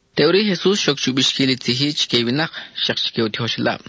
Teʼuri i Jesus xoc chu bixquil i tzij-i chique i winak, xak chique u tijoxelab: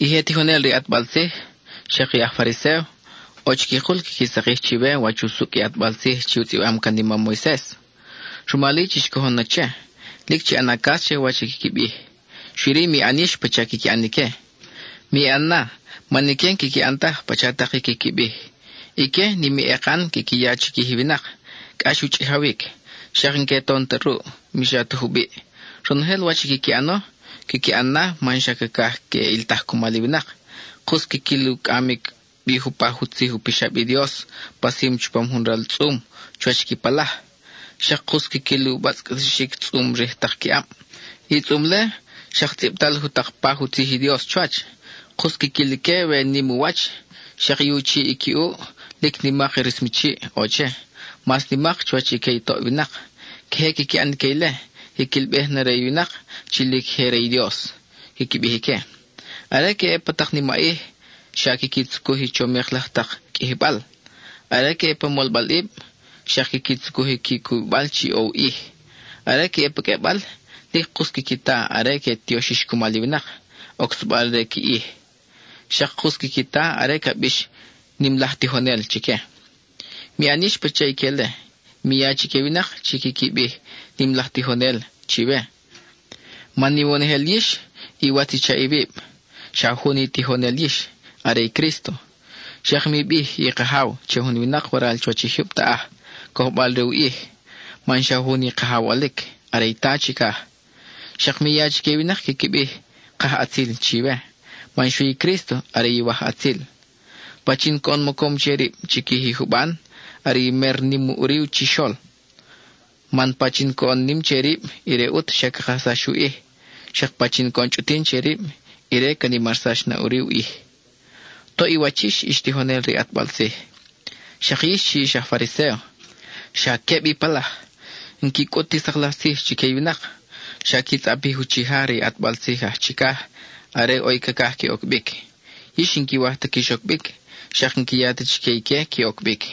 —I je tijonel re i ʼatbal tzij, xak i aj Fariséo, ʼo chiquikul quiqui sakij chiwe wach usucʼ i ʼatbal tzij chi u tzʼibam can i mam Moises. Rumal-i chix cojon na che, lic chi ʼana cas che wach i quiqui bij; xui-ri, mi ʼan yix pacha quiqui ʼan ique. Mi ʼan na, man ique n-quiqui ʼan taj pacha tak i quiqui bij. Ique, nim i ekan quiqui ya chiquij i winak, cʼax u chʼijawic; xak n-que ton ta ruʼ, mi xa ta jubiʼ. Ronojel wach i quiqui ʼano, quiqui ʼan na man xa cacaj que ʼiltaj cumal i winak. Kus quiquil u cʼamic bi jupaj u tzij u pixab i Dios pasim chupam jun ral tzʼum chuwach qui palaj. Xak kus quiquil u batzʼcatixic tzʼum rij tak qui ʼab. I tzʼum-le xak tzʼibtal jutakpaj u tzij i Dios chuwach; kus quiquil ique we nim u wach. Xak i u chiʼ i qui ʼuʼ, lic nimak i rismachiʼ ʼo che, mas nimak chuwach i que i toʼ winak. Queje quiqui ʼan ique ile, quiquilbej na re i winak chi lic je re i Dios, quiqui bij ique. Are que ʼe pa tak nimaʼij, xa quiqui tzucuj i chomik laj tak qʼuijibal. Are que ʼe pa molbalʼib, xak quiqui tzucuj i qui cubibal chi ʼo u ʼij. Are que ʼe pa qʼuebal, lic kus quiqui ta are que tioxix cumal i winak, ocsabal re qui ij. Xak kus quiqui ta are ca bix “nim laj tijonel” chique. Mi ʼan yix pacha ique-le; mi ya chique i winak chi quiqui bij “nim laj tijonel” chiwe. Man iwonojel yix, iwatz i chaʼ iwib; xa jun i Tijonel yix, are i Crísto. Xak mi bij i kajaw che jun winak waral chuwach i jyub taʼaj, cojbal re u ʼij, man xa jun i Kajaw ʼolic, are i Ta chicaj. Xak mi ya chique i winak quiqui bij “kajʼatzil” chiwe, man xui i Crísto are Iwajʼatzil. Pachin coʼon mocom che rib chiquij i juban, are i mer nim ʼuri chixol. Man pachin coʼon nim che rib, ire ʼut xa ca kajsax u ʼij; xak pachin coʼon chʼutin che rib, ire ca nimarsax na ʼuri u ʼij. Toʼ i wach yix, ix tijonel re i ʼatbal tzij, xak yix chi ix aj Fariséo. ¡Xa queb i palaj! N-qui cʼut ti sak laj tzij chique i winak; xa qui tzʼapij i uchija re i ʼatbal tzij aj chicaj are ʼo i cacaj que oc bic. Yix n-quiwaj ta quix oc bic, xak n-qui ya ta chique ique que oc bic.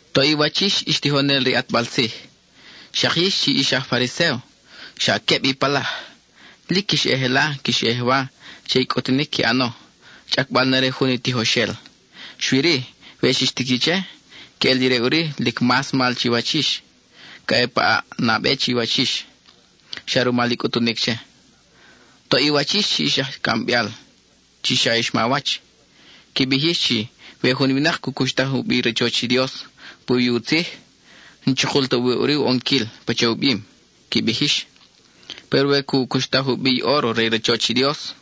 Toʼ i wach yix, ix tijonel re i ʼatbal tzij, xak yix chi ix aj Fariséo. ¡Xa queb i palaj! Lic quix ʼe jela, quix ʼe jewa, che i cʼutunic qui ʼano, chʼacbal na re jun i tijoxel. Xui-ri, we xix tiqui che, queʼel ire ʼuri lic mas mal chiwach yix; ca ʼe pa ʼaʼ nabe chiwach yix, xa rumal i cʼutum che. Toʼ i wach yix chi ix aj cʼambeal chi xa ix mawach. Qui bij yix chi “We jun winak cu cuxtaj u bi i rachoch i Dios puwi i u tzij, n-chukul ta ʼo wi ʼuri u ʼonquil pacha u bim,” qui bij yix. “Péro we cu cuxtaj u bi i óro re i rachoch i Dios,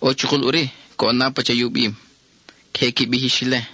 ʼo chukul ʼuri coʼon na pacha i u bim.” Queje qui bij yix ile.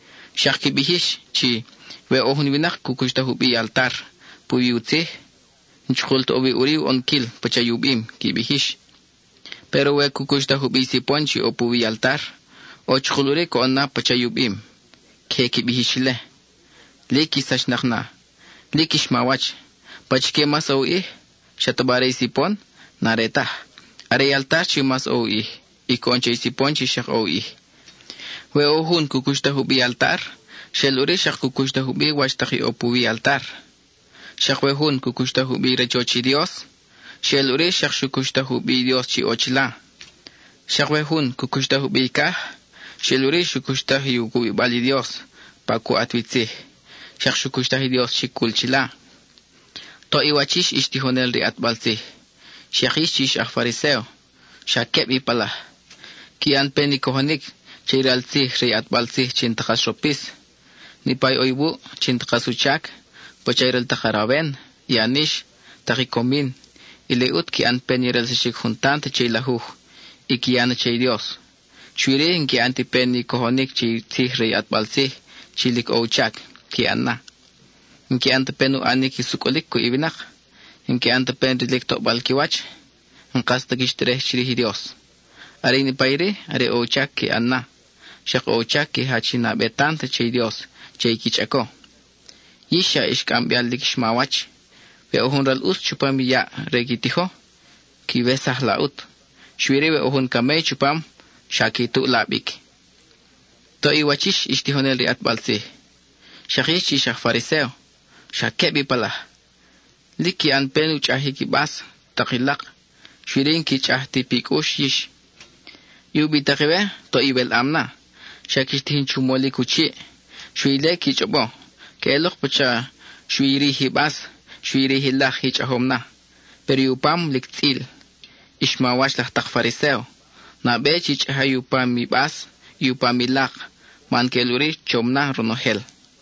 Xak qui bij yix chi “We jun winak cu cuxtaj u bi i altar puwi i u tzij, n-chukul ta ʼo wi ʼuri i u ʼonquil pacha u bim,” qui bij yix. “Péro we cu cuxtaj u bi i sipon chi ʼo puwi i altar, ʼo chukul ʼuri coʼon na pacha i u bim.” Queje qui bij yix ile. ¡Lic ix sachnak na; lic ix mawach! ¿Pachique mas ʼo i u ʼij? ¿Xataba are i sipon? N-are taj. Are i altar chi mas ʼo u ʼij, y coʼon che i sipon chi xak ʼo u ʼij. We ʼo jun cu cuxtaj u bi i altar, xeʼel ʼuri xak xu cuxtaj u bi wach tak i ʼo puwi i altar. Xak we jun cu cuxtaj u bi i rachoch i Dios, xeʼel ʼuri xak xu cuxtaj u bi i Dios chi ʼo chila. Xak we jun cu cuxtaj u bi i caj, xeʼel ʼuri xu cuxtaj i u cubibal i Dios, pa cu ʼat wi tzij, xak xu cuxtaj i Dios chi cul chila. Toʼ i wach yix, ix tijonel re i ʼatbal tzij, xak yix chi ix aj Fariséo. ¡Xa queb i palaj! (Qui ʼan pen i cojonic che i ral tzij re i ʼatbal tzij chi n-ta kas ropis.) Niʼpa i ʼo iwuʼ chi n-ta kas u chac, pacha i ral tak arawen, i anix, tak i comin, ile ʼut qui ʼan pen i relsaxic jun tant che i lajuj, y qui ya na che i Dios. Xui-ri, n-qui ʼan ti pen i cojonic che i tzij re i ʼatbal tzij chi lic ʼo u chac qui ʼan na. N-qui ʼan ta pen u ʼanic i sucʼulic cuʼ i winak; n-qui ʼan ta pen rilic tobal qui wach; n-kas ta quix terej chirij i Dios. Are i niʼpa iri, are ʼo u chac qui ʼan na; xak ʼo u chac qui jach i nabe tant che i Dios che i qui chʼaco. ¡Yix xa ix aj cʼambeal lic ix mawach! ¡We ʼo jun ral ʼus chupam i yaʼ re i qui tijo, quiwesaj la ʼut; xui-ri we ʼo jun camey chupam, xa qui tuʼ la bic! Toʼ i wach yix, ix tijonel re i ʼatbal tzij, xak yix chi ix aj Fariséo. ¡Xa queb i palaj! Lic qui ʼan pen u chʼajic i bas, tak i lak, xui-ri n-qui chʼaj ti i pi cʼux yix. I ubitak iwe, toʼ iwelʼam na, xa quix tijin chu molic u chiʼ, xui ile qui chʼobo. Queʼelok pacha xui i rij i bas, xui i rij i lak i chʼajom na, péro i u pam lic tzʼil. Ix mawach laj tak Fariséo, nabe chi chʼaja i u pam i bas, i u pam i lak, man queʼel ʼuri chom na ronojel.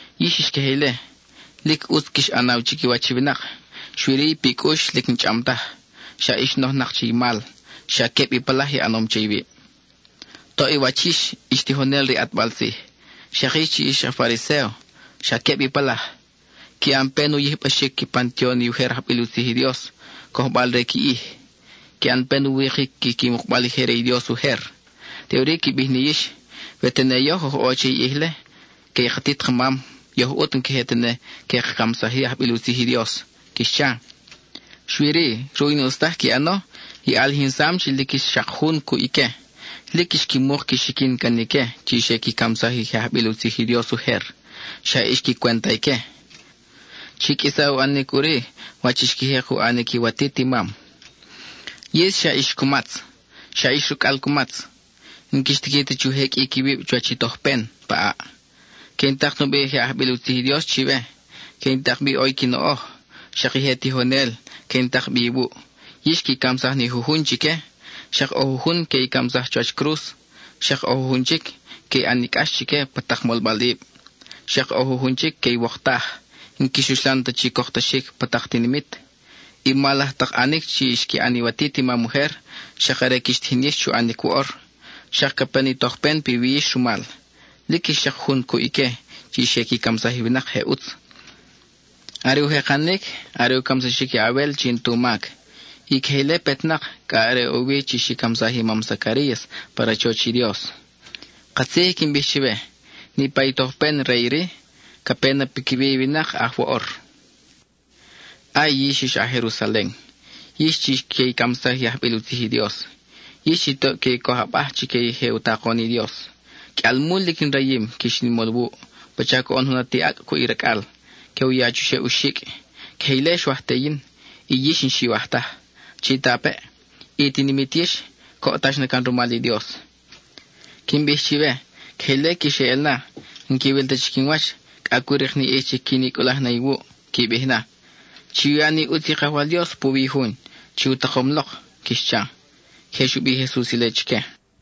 Yix ix queje ile; lic ʼutz quix ʼanaw chiquiwach i winak xui-ri i pi cʼux lic n-chʼam taj, xa ix nojnak che i mal; xa queb i palaj i ʼanom che iwib. Toʼ i wach yix, ix tijonel re i ʼatbal tzij, xak yix chi ix aj Fariséo. ¡Xa queb i palaj! Qui ʼan pen u yijbaxic qui pantion i ujer ajbil u tzij i Dios, cojbal re qui ʼij. Qui ʼan pen u wikic qui mukbal i je re i Dios ujer. Teʼuri qui bij ni yix, “We tene yoj oj ʼo che i ʼij-le que i katit kamam, yoj ʼut n-queje tene que ka camsaj-i i ajbil u tzij i Dios,” quix cha. Xui-ri, ruʼ i n-ʼus taj qui ʼano, i ʼalijinsam chi lic ix xak jun cuʼ ique. Lic ix qui muk qui xiquin can ique chi xe qui camsaj i je ajbil u tzij i Dios ujer; xa ix qui cwenta ique. Chi qʼuisa u ʼanic ʼuri wach i xqui jek u ʼanic iwatit i mam. ¡Yix xa ix cumatz! ¡Xa ix racʼal cumatz! N-quix tiqui ta chu jeqʼuic iwib chuwach i tojpen pa ʼaʼ. Que in tak nubi je ajbil u tzij i Dios chiwe, que in tak bi ʼo qui noʼoj, xak i je tijonel que in tak bi iwuʼ. Yix qui camsaj ni jujun chique, xak ʼo jujun que i camsaj chuwach cruz, xak ʼo jujun chic qui ʼan ni cʼax chique pa tak molbalʼib, xak ʼo jujun chic que iwoktaj, n-quix uxlan ta chi coktaxic pa tak tinimit. I mal laj tak ʼanic chi xqui ʼan iwatit i mam ujer, xak are quix tijin yix chu ʼanic woʼor, xak ca pe ni tojpen piwi yix rumal. Lic ix xak jun cuʼ ique chi xe qui camsaj i winak je ʼutz. Are u jekanic, are u camsaxic i a-Abel chi n-tu mac, y queje ile petnak cʼa are ʼo wi chi xi camsaj i mam Zacarías pa rachoch i Dios. Katzij i quin bij chiwe, niʼpa i tojpen re iri ca pe na piquiwi i winak aj woʼor. ¡Ay, yix, ix aj Jerusalen! ¡Yix chi que i camsaj i ajbil u tzij i Dios; yix chi toʼ qui coj abaj chique i je u takon i Dios! ¡Qʼuialmul lic in rayim quix in mol wuʼ, pacha coʼon jun ati acʼ cuʼ i racʼal, que u ya chuxeʼ u xicʼ! ¡Queje ile xwaj te yin, y yix n-xiwaj taj! Chitapeʼ, i tinimit yix coʼtax na can rumal i Dios. Quin bij chiwe, queje ile quix eʼel na; n-quiwil ta chic in wach cʼa cu rik ni ʼij chi quin i cʼulaj na iwuʼ. Qui bij na: “¡Chu ya ni ʼutz i Kajwal Dios puwi i Jun chi u takom lok!” quix cha. (Queje xu bij i Jesus ile chique.)